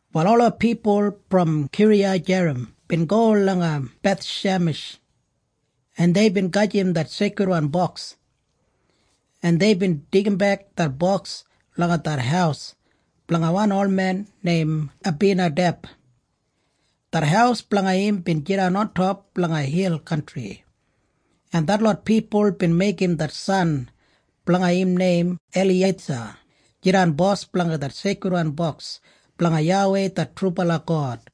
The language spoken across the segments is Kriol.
Wal ola pipul brom Kiriyajerim bin go langa Bethshemesh, en deibin gajim det Seikridwan Boks, en deibin deigimbek det boks langa det haus blanga wan olmen neim Abinadeb. Det haus blanga im bin jidan ontop langa hil kantri, en detlot pipul bin meigim det san blanga im neim Eliyeisa jidan bos blanga det Seikridwan Boks blanga YAWEI det trubala God.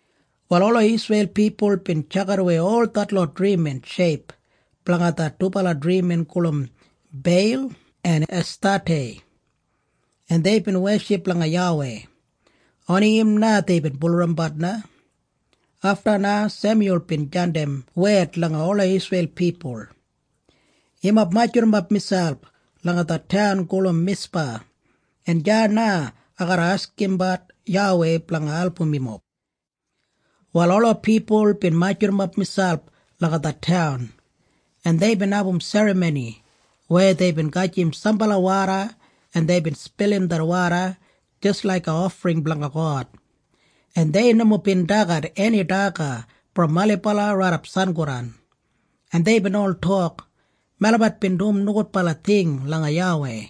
Wal ola Isreil pipul bin tjakidawei ol detlot drimin sheip blanga det dubala drimin gulum Beil en Estatei, en deibin weship langa YAWEI. Oni im na deibin bulurrumbat na. Afta na Semyul bin jandim wed langa ola Isreil pipul, “Yumob majurrumap miselp langa det taun gulum Mispa, en deya na ai garra askimbat YAWEI blanga album yumob.” Wal ola pipul bin majurrumap miselp langa det taun, en deibin abum serramoni weya deibin gajim sambala woda, en deibin spilim det woda jis laiga ofring blanga God, en dei nomo bin dagat eni daga brom ailibala raidap sangodan, en deibin ol tok, “Melabat bin dum nogudbala ting langa YAWEI.”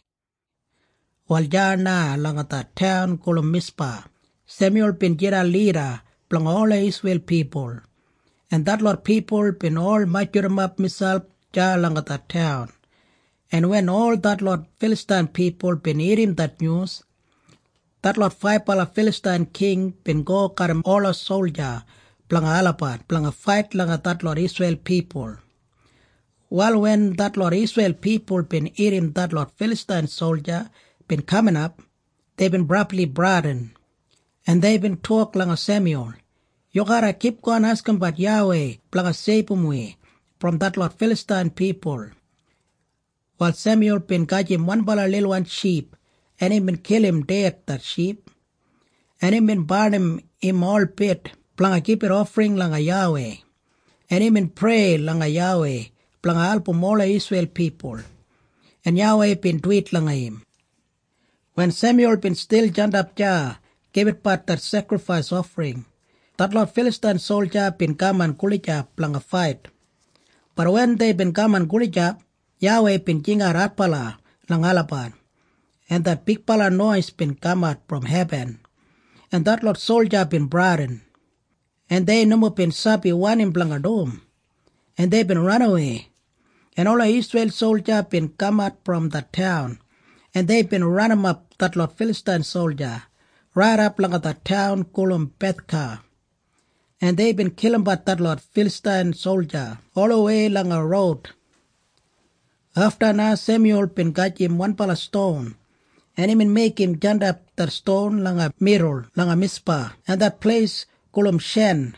Wal deya na langa det taun gulum Mispa, Semyul bin jidan lida blanga ola Isreil pipul, en detlot pipul bin ol majurrumap miselp deya langa det taun, en wen ol detlot Filastain pipul bin irrim det nyus, detlot faibala Filastain king bin go garram ola solja blanga olabat blanga fait langa detlot Isreil pipul. Wal wen detlot Isreil pipul bin irrim detlot Filastain solja bin kaminap, deibin brabli bradin, en deibin tok langa Semyul, “Yu garra kipgon askimbat YAWEI blanga seibum wi brom detlot Filastain pipul.” Wal Semyul bin gajim wanbala lilwan ship, en imbin kilim ded det ship, en imbin barnim im holbit blanga gibit ofring langa YAWEI, en imbin prei langa YAWEI blanga album ola Isreil pipul, en YAWEI bin duwit langa im. Wen Semyul bin stil jandap deya gibitbat det sekrifais ofring, detlot Filastain solja bin kaman gulijap blanga fait. Bat wen deibin kaman gulijap, YAWEI bin jingat adbala langa olabat, en det bigbala nois bin kamat brom hebin, en detlot solja bin bradin, en dei nomo bin sabi wanim blanga dum, en deibin ranawei, en ola Isreil solja bin kamat brom det taun, en deibin ranimap detlot Filastain solja raidap langa det taun gulum Bethka, en deibin kilimbat detlot Filastain solja olawei langa roud. Afta na Semyul bin gajim wanbala ston, en imbin meigim jandap det ston langa midul langa Mispa en det pleis gulum Shen,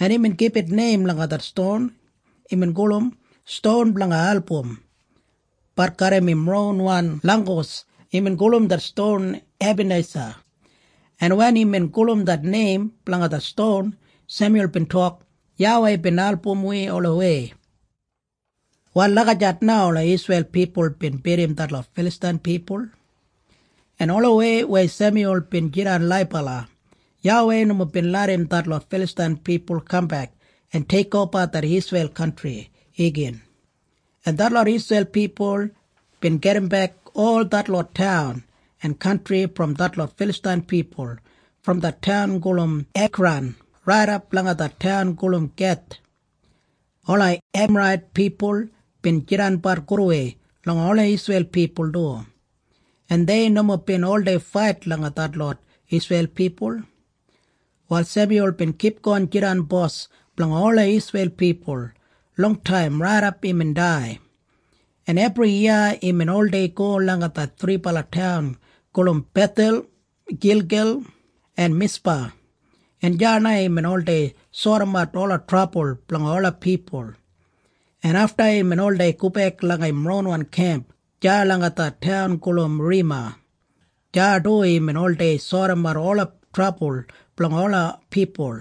en imbin gibit neim langa det ston. Imbin gulum “Ston blanga Album.” Bat garram im ronwan langgus imbin gulum det ston Ebanisa, en wen imbin gulum det neim blanga det ston, Semyul bin tok, “YAWEI bin album wi olawei.” Wal lagijat na ola Isreil pipul bin bidim detlot Filastain pipul, en olawei weya Semyul bin jidan laibala, YAWEI nomo bin larram detlot Filastain pipul kambek en teikoba det Isreil kantri igin, en detlot Isreil pipul bin gedimbek ol detlot taun en kantri brom detlot Filastain pipul brom det taun gulum Ekran raidap langa det taun gulum Geth. Ola Emarait pipul bin jidanbat gudwei langa ola Isreil pipul du, en dei nomo bin oldei fait langa detlot Isreil pipul. Wal Semyul bin kipgon jidan bos blanga ola Isreil pipul longtaim raidap imbin dai, en ebriyiya imbin oldei go langa det thribala taun gulum Bethel, Gilgel en Mispa, en deya na imbin oldei sodimat ola trabul blanga ola pipul, en afta imbin oldei gobek langa im ronwan kemp deya langa det taun gulum Rema. Deya du imbin oldei sodimat ola trabul blanga ola pipul,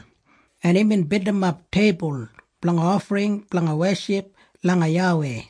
en imbin bildimap teibul blanga ofring blanga weship langa YAWEI.